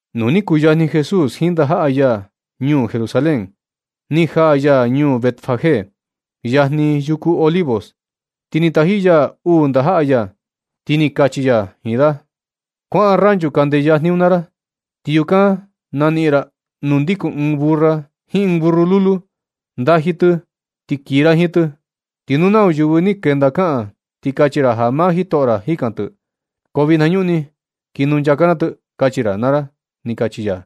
Nu ni kuyajni Jesús jiin ndajaꞌa ya ñuu Jerusalén, ni jaa ya ñuu Betfagé, yajni yuku Olivos, ti ni taji ya uu ndajaꞌa ya, ti ni kachi ya jiin da: ―Kuaꞌan ranchu kande yajni un naa ra. Ti yukan naniꞌin ra nuu ndikun ɨɨn burra jiin ɨɨn burru lulu. Ndaji tɨ, ti kii ra jiin tɨ. Ti nu nau yɨvɨ ni kenda kaꞌan, ti kachi ra ja maa jitoꞌo ra jikan tɨ, ko vinañuꞌni kii nunchaka na tɨ, kachi ra naa ra ―ni kachi ya.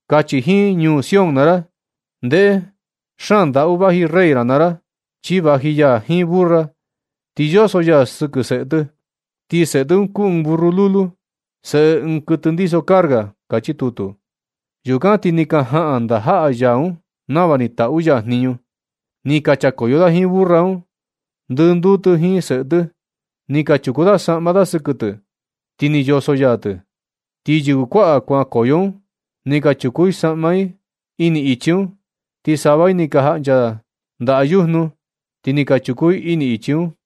Kachi jiin ñuu Sion naa ra: “Ndeꞌe, xaan ndaꞌu vaji rey ra naa ra, chi vaji ya jiin burra, ti yoso ya sɨkɨ seꞌe tɨ. Ti seꞌe tɨ un kuu ɨɨn burru lulu, seꞌe ɨɨn kɨtɨ ndiso carga.” Kachi tutu. Yukan ti ni ka jaꞌan ndajaꞌa ya un nava ni taꞌu ya jniñu. Ni ka chakoyo da jiin burra un, ndɨnduu tɨ jiin seꞌe tɨ. Ni ka chuku da saꞌma da sɨkɨ tɨ, ti ni yoso ya tɨ. Ti yɨvɨ kuaꞌa kuankoyo un ni ka chuku i saꞌma i ini ichi un, ti sava i ni ka jaꞌncha ndaꞌa yujnu. Ti ni ka chuku i ini ichi un.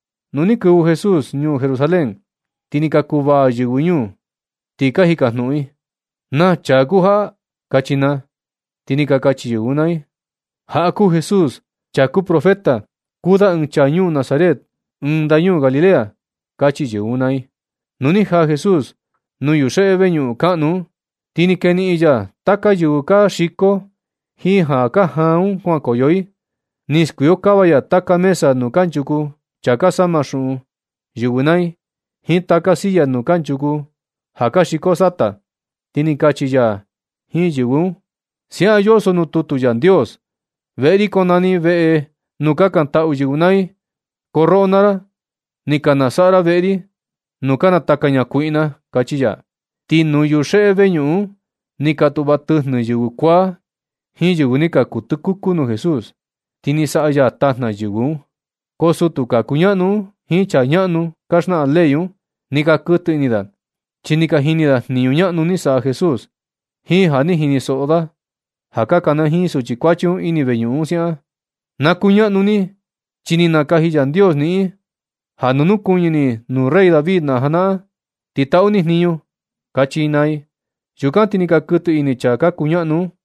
Nu ni kɨvɨ Jesús ñuu Jerusalén, ti ni ka kuvaa yɨvɨ ñuu, ti ka jikajnuꞌun i: ―¿Naa chaa kuu jaꞌa? ―kachi naa. Ti ni ka kachi yɨvɨ un naa i: ―Jaꞌa kuu Jesús chaa kuu profeta, kuu da ɨɨn chaa ñuu Nazaret, ɨɨn ndañuu Galilea ―kachi yɨvɨ un naa i. Nu ni jaa Jesús nuu yuxeꞌe veñuꞌun kaꞌnu un, ti ni keniꞌin ya taka yɨvɨ ka xiko jiin ja ka jaan un kuankoyo i. Ni skuikokava ya taka mesa nuu kanchuku chaa ka sama xuꞌun yɨvɨ naa i, jiin taka silla nuu kanchuku ja ka xiko sata. Ti ni kachi ya jiin yɨvɨ un: ―Siaꞌan yoso nuu tutu Yandios: “Veꞌe ri konani veꞌe nuu kakantaꞌu yɨvɨ naa i”, ko roꞌo naa ra, ni ka nasaꞌa ra veꞌe ri nuu ka nataka ñakuiꞌna ―kachi ya. Ti nuu yuxeꞌe veñuꞌun un ni ka tuꞌva tɨjnɨ yɨvɨ kuaa jiin yɨvɨ ni ka kuu tɨkuku nuu Jesús, ti ni saꞌa ya tajna yɨvɨ un. Ko sutu ka kuñaꞌnu un jiin chaa ñaꞌnu ka xnaꞌan ley un, ni ka kɨtɨ ini da, chi ni ka jini da jniñu ñaꞌnu ni saꞌa Jesús, jiin ja ni jinisoꞌo da ja ka kanajiin suchi kuachi un ini veñuꞌun un siaꞌan: “¡Na kuñaꞌnu ni, chi ni nakaji Yandios niꞌin ja na nukuñɨ ni nuu rey David na janaꞌan, ti taꞌu ni jniñu!” ―kachi i naa i. Yukan ti ni ka kɨtɨ ini chaa ka kuñaꞌnu un,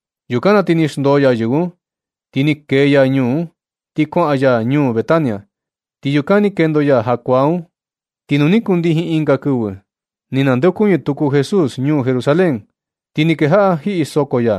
Yukan na ti ni xndoo ya yɨvɨ un, ni kee ya ñuu un, ti kuaꞌan ya ñuu Betania. Ti yukan ni kendo ya jakuaa un. Ti nu ni kundijin ɨnga kɨvɨ, ni nandeokuñɨ tuku Jesús ñuu Jerusalén, ti ni kejaꞌa jiꞌi ya soko.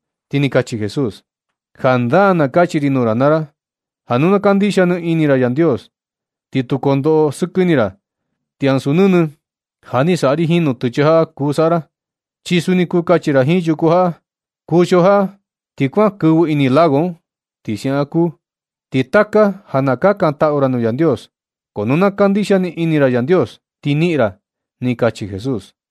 Ti ni kachi Jesús: ―Jandaa na kachi ri nuu ra naa ra ja nu ka kandixia ni ini ra Yandios, ti tu kondoꞌo sɨkɨ ini ra, ti ansu nɨnɨ ja ni saꞌa ri jiin nutɨchɨ jaꞌa kuu saꞌa ra. Chi suni kuu kachi ra jiin yuku jaꞌa: “Kuxio jaꞌa ti kuan kɨvɨ ini lago un”, ti siaꞌan kuu. Ti taka ja na kakantaꞌu ra nuu Yandios, ko nu na kandixia ni ini ra Yandios, ti niꞌin ra ―ni kachi Jesús.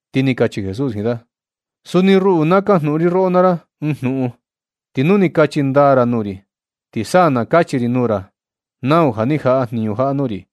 Ti ni kachi Jesús jiin da: ―Suni ruꞌu, na kajnuꞌun ri roꞌo naa ra ɨɨn jnuꞌun. Ti nu ni ka kachi ndaa ra nuu ri, ti sa na kachi ri nuu ra nau ja ni jaꞌa jniñu jaꞌa nuu ri.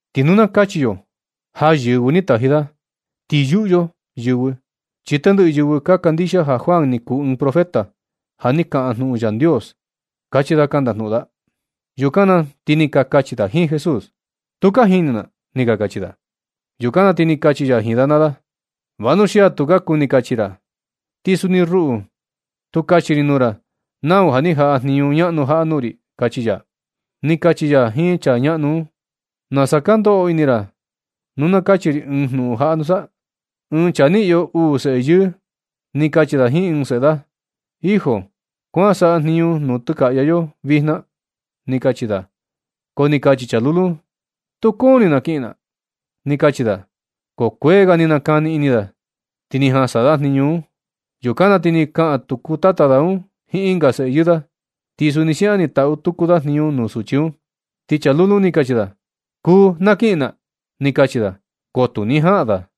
Ti nu na kachi yo ja yɨvɨ ni taji da, ti yuꞌu yo yɨvɨ, chi tendɨꞌɨ yɨvɨ ka kandixia ja Juan ni kuu ɨɨn profeta, ja ni kaꞌan jnuꞌun Yandios ―kachi da ka ndajnuꞌun da. Yukan na ti ni ka kachi da jiin Jesús: ―Tu ka jini na ―ni ka kachi da. Yukan na ti ni kachi ya jiin da naa da: ―Vanuxia tu ka kuni kachi ra, ti suni ruꞌu, tu ra kachi ri nuu ra nau ja ni jaꞌa jniñu ñaꞌnu jaꞌa nuu ri ―kachi ya. Ni kachi ya jiin chaa ñaꞌnu un: ―¿Nasa ka ndoꞌo ini ra nu na kachi ri ɨɨn jnuꞌun jaꞌa nusa? Ɨɨn chaa ni iyo uu seꞌe yɨɨ, ni kachi da jiin ɨɨn seꞌe da un: “Hijo, kuan saꞌa jniñu nuu nutɨkaꞌya yo vijna”, ni kachi da. Ko ni kachi chaa lulu un: “Tu kuni na kiꞌin na”, ni kachi da. Ko kuee ga ni nakani ini da, ti ni jan saꞌa da jniñu un. Yukan na ti ni kaꞌan tuku tata da un jiin ɨnga seꞌe yɨɨ da, ti suni siaꞌan ni taꞌu tuku da jniñu nuu suchi un, ti chaa lulu un ni kachi da: “Kuu, na kiꞌin na”, ni kachi da. Ko tu ni jaꞌan da.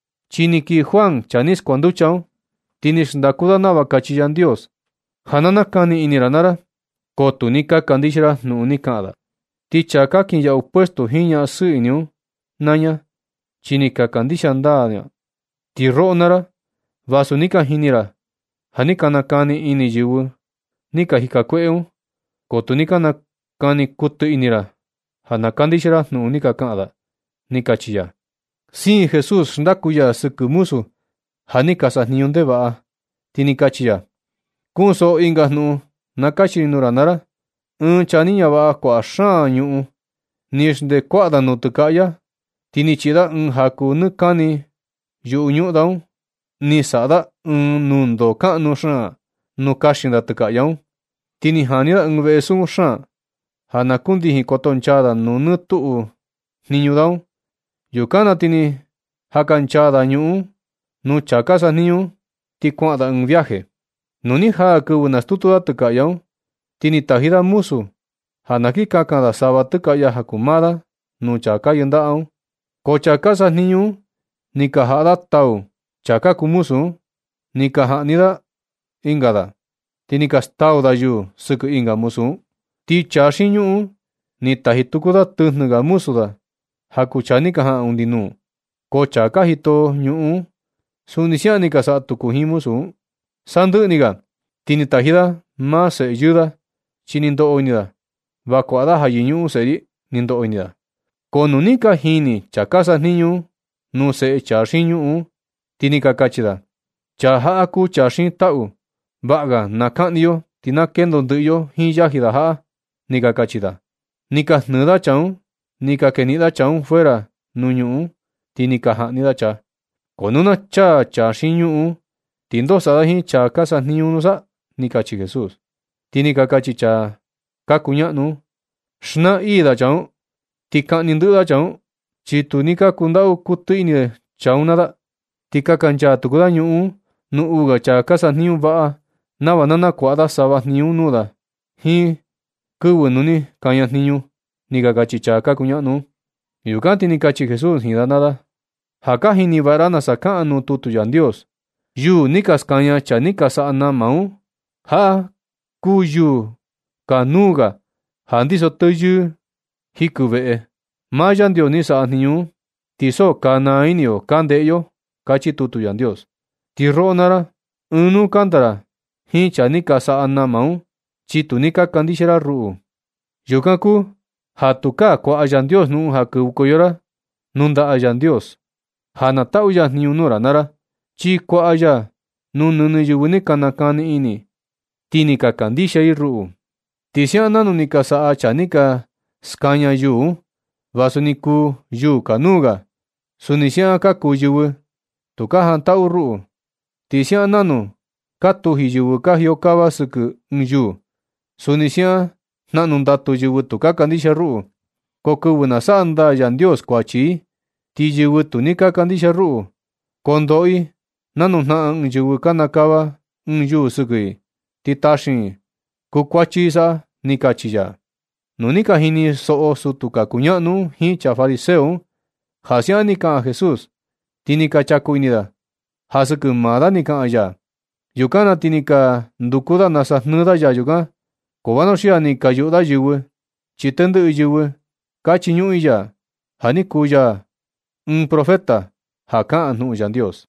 Chi ni kii Juan, chaa ni skuanducha un, ti ni xndaku da nava kachi Yandios ja na nakani ini ra naa ra, ko tu ni ka kandixia ra jnuꞌun ni kaꞌan da. Ti chaa ka kinyaꞌu puesto jiin ñaꞌan sɨɨ ini un naa ña, chi ni ka kandixia ndaa da. Ti roꞌo naa ra, vasu ni ka jini ra ja, ja ni ka nakani ini yɨvɨ ni ka jika kueꞌe un, ko tu ni ka nakani kuɨtɨ ini ra ja na kandixia ra jnuꞌun ni kaꞌan da ―ni kachi ya. Siin Jesús xndaku ya sɨkɨ muzu ja ni ka sajniñu ndevaꞌa, ti ni kachi ya: ―Kunsoꞌo ɨnga jnuꞌun na kachi ri nuu ra naa ra. Ɨɨn chaa ni ñavaꞌa kuaꞌa xaan ñuꞌun ni xndee kuaꞌa da nutɨkaꞌya, ti ni chiꞌi da ɨɨn jaku nɨɨ kani yuꞌu ñuꞌun da un. Ni saꞌa da ɨɨn nundoo kaꞌnu xaan nuu kaxin da tɨkaꞌya un, ti ni jani da ɨɨn veꞌe sukun xaan ja na kundijin kotonchaa da nuu nɨ tuꞌu jniñu da un. Yukan na ti ni jakanchaa da ñuꞌun un nuu chaa ka sajniñu un, ti kuaꞌan da ɨɨn viaje. Nu ni jaa kɨvɨ nastutu da tɨkaꞌya un, ti ni taji da muzu ja na kin kakan da sava tɨkaꞌya ja kuu maa da nuu chaa ka yɨndaꞌa un. Ko chaa ka sajniñu un ni ka jaꞌa da tau ɨɨn chaa ka kuu muzu un, ni ka jaꞌni da ɨnga da, ti ni ka stau da yuu sɨkɨ ɨnga muzu un. Ti chaa xiin ñuꞌun un ni taji tuku da tɨjnɨ ga muzu da ja kuu chaa ni ka jaꞌan undi nuu, ko chaa ka jito ñuꞌun, suni siaꞌan ni ka saꞌa tuku da jiin muzu un. Sandɨꞌɨ ni ga, ti ni taji da maa seꞌe yɨɨ da, chi ni ndoꞌo ini da: “Va kuaꞌa da ja yɨñuꞌun seꞌe ri”, ni ndoꞌo ini da. Ko nu ni ka jini chaa ka sajniñu un nuu seꞌe chaa xiin ñuꞌun un, ti ni ka kachi da: “Chaa jaꞌa kuu ja xiin taꞌu. Vaꞌa ga na kaꞌni yo ti na kendo ndɨꞌɨ yo jiin yaji jaꞌa”, ni ka kachi da. Ni ka jnɨɨ da chaa un, ni ka keniꞌin da chaa un fuera nuu ñuꞌun un, ti ni ka jaꞌni da chaa. Ko nu na chaa chāā xiin ñuꞌun un, ti ¿ndoo saꞌa da jiin chaa ka sajniñu un nusa? ―kachi Jesús. Ti ni ka kachi chaa ka kuñaꞌnu un: ―Naa ii da chaa un, chi kaꞌni ndɨꞌɨ da chaa, chi tu kundaꞌu kuɨtɨ ini da chaa un naa da. Ti kakanchaa tuku da ñuꞌun un nuu uu ga chaa ka sajniñu vaꞌa, nava na nakuaꞌa da sava jniñu un nuu da jiin kɨvɨ nu ni kaña jniñu ―ni ka kachi chaa ka kuñaꞌnu un. Yukan ti ni kachi Jesús jiin da naa da: ―Ja ka jini vaꞌa ra nasa kaꞌan nuu tutu Yandios: Yuū ni ka skaña chaa ni ka saꞌa nama un, jaꞌa kuu yuū kanuu ga ja ndiso teyɨɨ ga jɨkɨ ɨɨn veꞌe. Maa Yandios ni saꞌa jniñu un, ti so ka naa ini yo ka ndeꞌe yo. Kachi tutu Yandios. Ti roꞌo naa ra, ɨɨn nuu kanda ra jiin chaa ni ka saꞌa nama un, chi tu ni ka kandixia ra ruꞌu. Yukan kuu ja tukaa kuaꞌa Yandios jnuꞌun ja kɨvɨkoyo kuaꞌa ra ndaꞌa ya ja na taꞌu ya jniñu nuu ra naa ra. Chi kuaꞌa ya nu nɨnɨ yɨvɨ ni ka nakani ini ti ni ka kandixia i ruꞌu. Ti siaꞌan nanu ni ka saꞌa chaa ni ka skaña yuū un, vasu ni kuu yuū kanuu ga, suni siaꞌan ka kuu yɨvɨ tu ka jantaꞌu ruꞌu. Ti siaꞌan nanu ka tuji yɨvɨ ka jiokava sɨkɨ ɨɨn yuū, suni siaꞌan jnaꞌnu ndatu yɨvɨ tu kandixia ruꞌu. Ko kɨvɨ na saꞌa ndaa Yandios kuachi i, ti yɨvɨ tu ni kandixia ruꞌu, kondoꞌo i nanu jnaꞌan ɨɨn yɨvɨ kanakava ɨɨn yuū sɨkɨ i, ti taxiin i, kukuachi i saꞌa ―ni kachi ya. Nu ni ka jinisoꞌo sutu ka kuñaꞌnu un jiin chaa fariseo un ja siaꞌan ni kaꞌan Jesús, ti ni ka chaku ini da ja sɨkɨ maa da ni kaꞌan ya. Yukan na ti ni ka nduku da nasa jnɨɨ da ya yukan, ko vanuxia ni ka yuꞌu da yɨvɨ, chi tendɨꞌɨ yɨvɨ ka chiñuꞌun i ya, ja ni kuu ya ɨɨn profeta ja kaꞌan jnuꞌun Yandios.